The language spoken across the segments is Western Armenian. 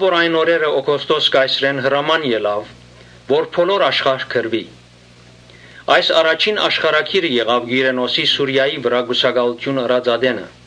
Այն օրերը Օգոստոս կայսրէն հրաման ելաւ որ բոլոր աշխարհ գրուի։ (Այս առաջին աշխարհագիրը եղաւ Կիւրենոսի Սիւրիոյ վրայ կուսակալութիւն ըրած ատենը)։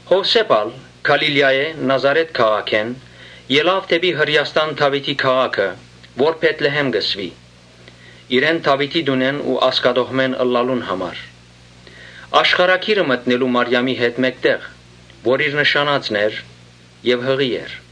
Յովսէփ ալ Գալիլիայէն, Նազարէթ քաղաքէն, ելաւ դէպի Հրէաստան, Դաւիթին քաղաքը, որ Բեթլեհէմ կը կոչուի, (ինք Դաւիթին տունէն ու ազգատոհմէն ըլլալուն համար), Աշխարհագիրը մտնելու Մարիամին հետ մէկտեղ, որ իր նշանածն էր եւ յղի էր։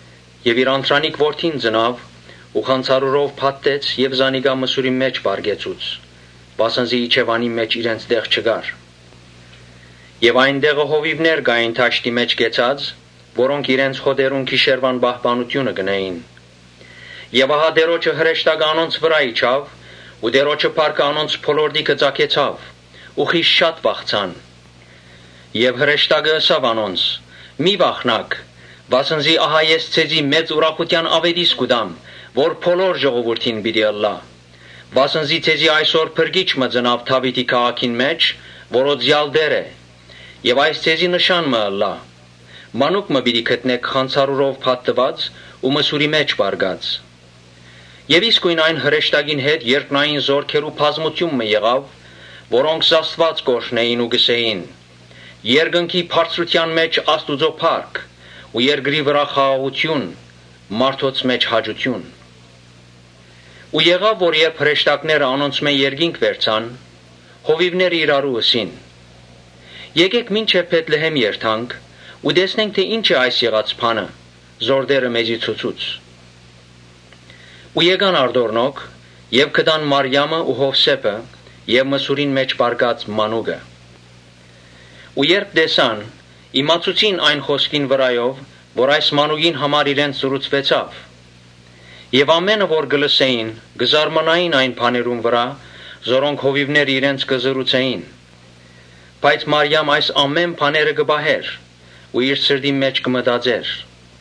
Իր անդրանիկ որդին ծնաւ ու խանձարուրով փաթթեց եւ զանիկա մսուրին մէջ պառկեցուց, վասն զի իջեւանին մէջ իրենց տեղ չկար։ Այն տեղը հովիւներ կային դաշտին մէջ կեցած, որոնք իրենց հօտերուն գիշերուան պահպանութիւնը կ’ընէին։ Ահա Տէրոջը հրեշտակը անոնց վրայ իջաւ ու Տէրոջը փառքը անոնց բոլորտիքը ծագեցաւ ու խիստ շատ վախցան։ Բայց հրեշտակը ըսաւ անոնց. «Մի՛ վախնաք, վասն զի ահա ես ձեզի մեծ ուրախութեան աւետիս մը կու տամ, որ բոլոր ժողովուրդին պիտի ըլլայ։ Վասն զի այսօր Փրկիչ մը ծնաւ Դաւիթին քաղաքին մէջ, որ Օծեալ Տէր է։ Եւ այս ձեզի նշան մը ըլլայ՝ մանուկ մը պիտի գտնէք խանձարուրով փաթթուած ու մսուրի մէջ պառկած»։ Իսկոյն այն հրեշտակին հետ երկնային զօրքերու բազմութիւն մը եղաւ, որոնք Աստուած կ’օրհնէին ու կ’ըսէին. «Երկնքի բարձրութեան մէջ Աստուծոյ փառք, երկրի վրայ խաղաղութիւն, մարդոց մէջ հաճութիւն»։ Երբ հրեշտակները անոնցմէ երկինք վերցուեցան, հովիւները իրարու ըսին. «Եկէք մինչեւ Բեթլեհէմ երթանք ու տեսնենք թէ ի՞նչ է այս եղած բանը, որ Տէրը մեզի ցուցուց»։ Գացին արտորալով եւ գտան Մարիամը ու Յովսէփը եւ մսուրին մէջ պառկած մանուկը։ Երբ տեսան, իմացուցին այն խօսքերը որ այս մանուկին համար իրենց ըսուեցաւ։ Ամէնքը որ կը լսէին, կը զարմանային այն բաներուն վրայ, որոնք հովիւները իրենց կ’ըսէին։ Բայց Մարիամ այս ամէն բաները կը պահէր ու իր սրտին մէջ կը մտածէր։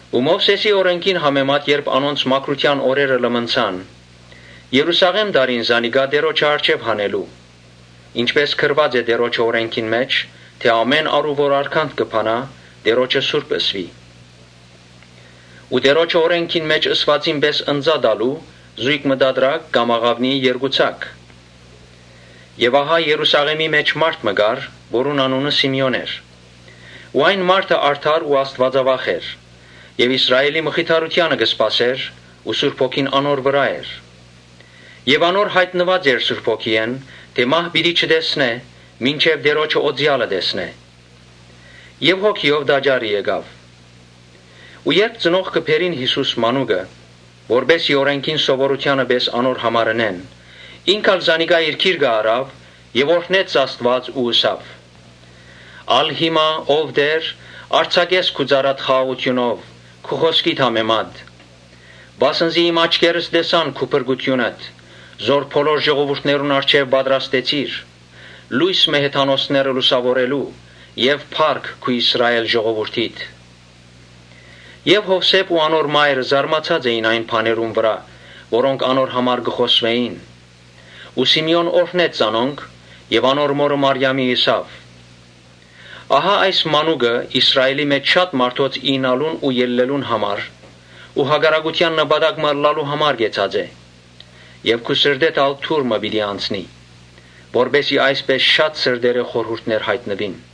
Մովսէսին օրէնքին համեմատ երբ Ոմանք, անորանոնց մաքրութեան օրերը լմնցան, Երուսաղէմ տարին զանիկա Տէրոջը առջեւ հանելու, (Ինչպէս գրուած է Տէրոջը օրէնքին մէջ, թէ՝ ‘Ամէն արու որ արգանդ կը բանայ՝ Տէրոջը սուրբ ըսուի’), Տէրոջը օրէնքին մէջ ըսուածին պէս ընծայ տալու՝ զոյգ մը տատրակ կամ աղաւնիի երկու ձագ։ Այն ատեն Երուսաղէմի մէջ մարդ մը կար, որուն անունը Սիմէոն էր. անիկա արդար ու աստուածավախ էր։ Իսրայէլի մխիթարութեանը կը սպասէր ու Սուրբ Հոգին անոր վրայ էր։ Անոր յայտնուած էր Սուրբ Հոգիէն թէ մահ պիտի չտեսնէ, մինչեւ Տէրոջը Օծեալը տեսնէ։ Ան ալ Հոգիով տաճարը եկաւ։ Ու երբ ծնողքը բերին Յիսուս մանուկը, որպէս զի օրէնքին սովորութեանը պէս անոր համար ընեն, Ինքն ալ զանիկա իր գիրկն առաւ եւ օրհնեց Աստուած ու ըսաւ. «Ալ հիմա, ո՛վ Տէր, արձակէ քու ծառադ խաղաղութիւնով քու խօսքիդ համեմատ. Վասն զի իմ աչքերս տեսան քու փրկութիւնդ Որ բոլոր ժողովուրդներուն առջեւ պատրաստեցիր, Լոյս մը հեթանոսները լուսաւորելու եւ փառք քու Իսրայէլ ժողովուրդիդ»։ Յովսէփ ու անոր մայրը զարմացած էին այն բաներուն վրայ՝ որոնք անոր համար կը խօսուէին։ Սիմէոն օրհնեց զանոնք եւ անոր մօրը Մարիամին ըսաւ. «Ահա այս մանուկը Իսրալէլի մէջ շատ մարդոց իյնալուն ու ելլելուն համար ու հակառակութեան նշան մը ըլլալու համար կեցած է. (Եւ քու սրտէդ ալ թուր մը պիտի անցնի.) որպէս զի այսպէս շատ սրտերէ խորհուրդներ յայտնուին»։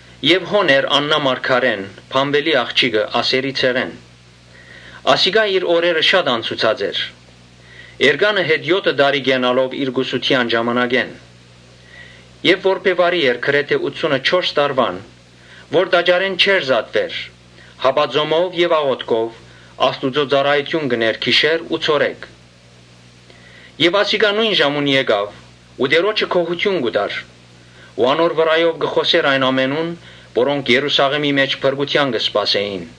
Հոն էր Աննա մարգարէն, Փանուէլին աղջիկը, Ասերի ցեղէն. ասիկա իր օրերը անցուցած էր, էրկանը հետ եօթը տարի կենալով իր կուսութեան ժամանակէն Եւ որբեւարի էր գրեթէ ութսունըչորս տարեկան ու տաճարէն չէր զատուեր, հապա ծոմով եւ աղօթքով Աստուծոյ ծառայութիւն կ’ընէր գիշեր ու ցորեկ։ Ասիկա նոյն ժամուն եկաւ ու Տէրոջը գոհութիւն տուաւ ու անոր վրայով խօսեցաւ այն ամենուն՝ որոնք Երուսաղէմի մէջ փրկութեան կը սպասէին։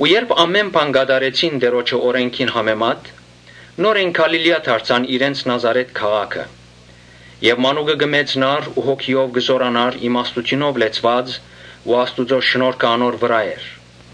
Երբ ամէն բան կատարեցին Տէրոջը օրէնքին համեմատ, նորէն Գալիլիա դարձան, իրենց Նազարէթ քաղաքը։ Մանուկը կը մեծնար ու հոգիով կը զօրանար իմաստութիւնով լեցուած ու Աստուծոյ շնորհքը անոր վրայ էր։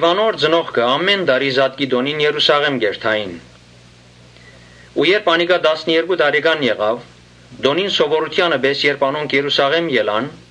Անոր ծնողքը ամէն տարի զատկի տօնին Երուսաղէմ կ’երթային։ Ու երբ անիկա տասներկու տարեկան եղաւ, տօնին սովորութեանը պէս անոնք Երուսաղէմ գացին։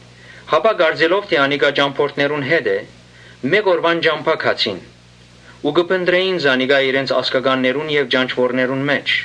Հապա կարծելով թէ անիկա ճամբորդներուն հետ է, մէկ օրուան ճամբայ գացին, յետոյ սկսան փնտռել զանիկա իրենց ազգականներուն եւ ճանչուորներուն մէջ։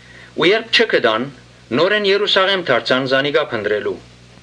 Երբ չգտան, նորէն Երուսաղէմ դարձան զանիկա փնտռելու։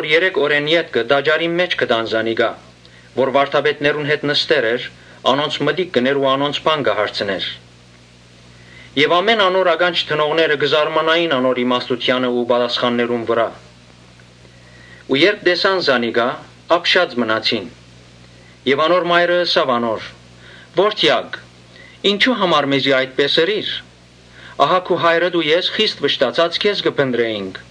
Երեք օրէն ետքը տաճարին մէջ գտան զանիկա, որ վարդապետներուն հետ նստեր էր, անոնց մտիկ կ’ընէր ու անոնց բան կը հարցնէր։ Անոր ականջ դնողները կը զարմանային անոր իմաստութեանը ու պատասխաններուն վրայ։ Երբ տեսան զանիկա, ապշած մնացին։ Մայրը ըսաւ անոր. «Ո՛րդեակ, ինչո՞ւ համար մեզի այդպէս ըրիր. ահա քու հայրդ ու ես խիստ վշտացած քեզ կը փնտռէինք»։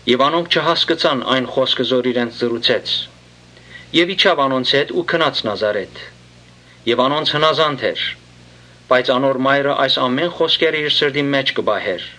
Անոնք չհասկցան այն խօսքը որ իրենց ըսուեցաւ։ Եւ իջաւ անոնց հետ ու գնաց Նազարէթ եւ անոնց հնազանդ էր. բայց անոր մայրը այս բոլոր խօսքերը իր սրտին մէջ կը պահէր։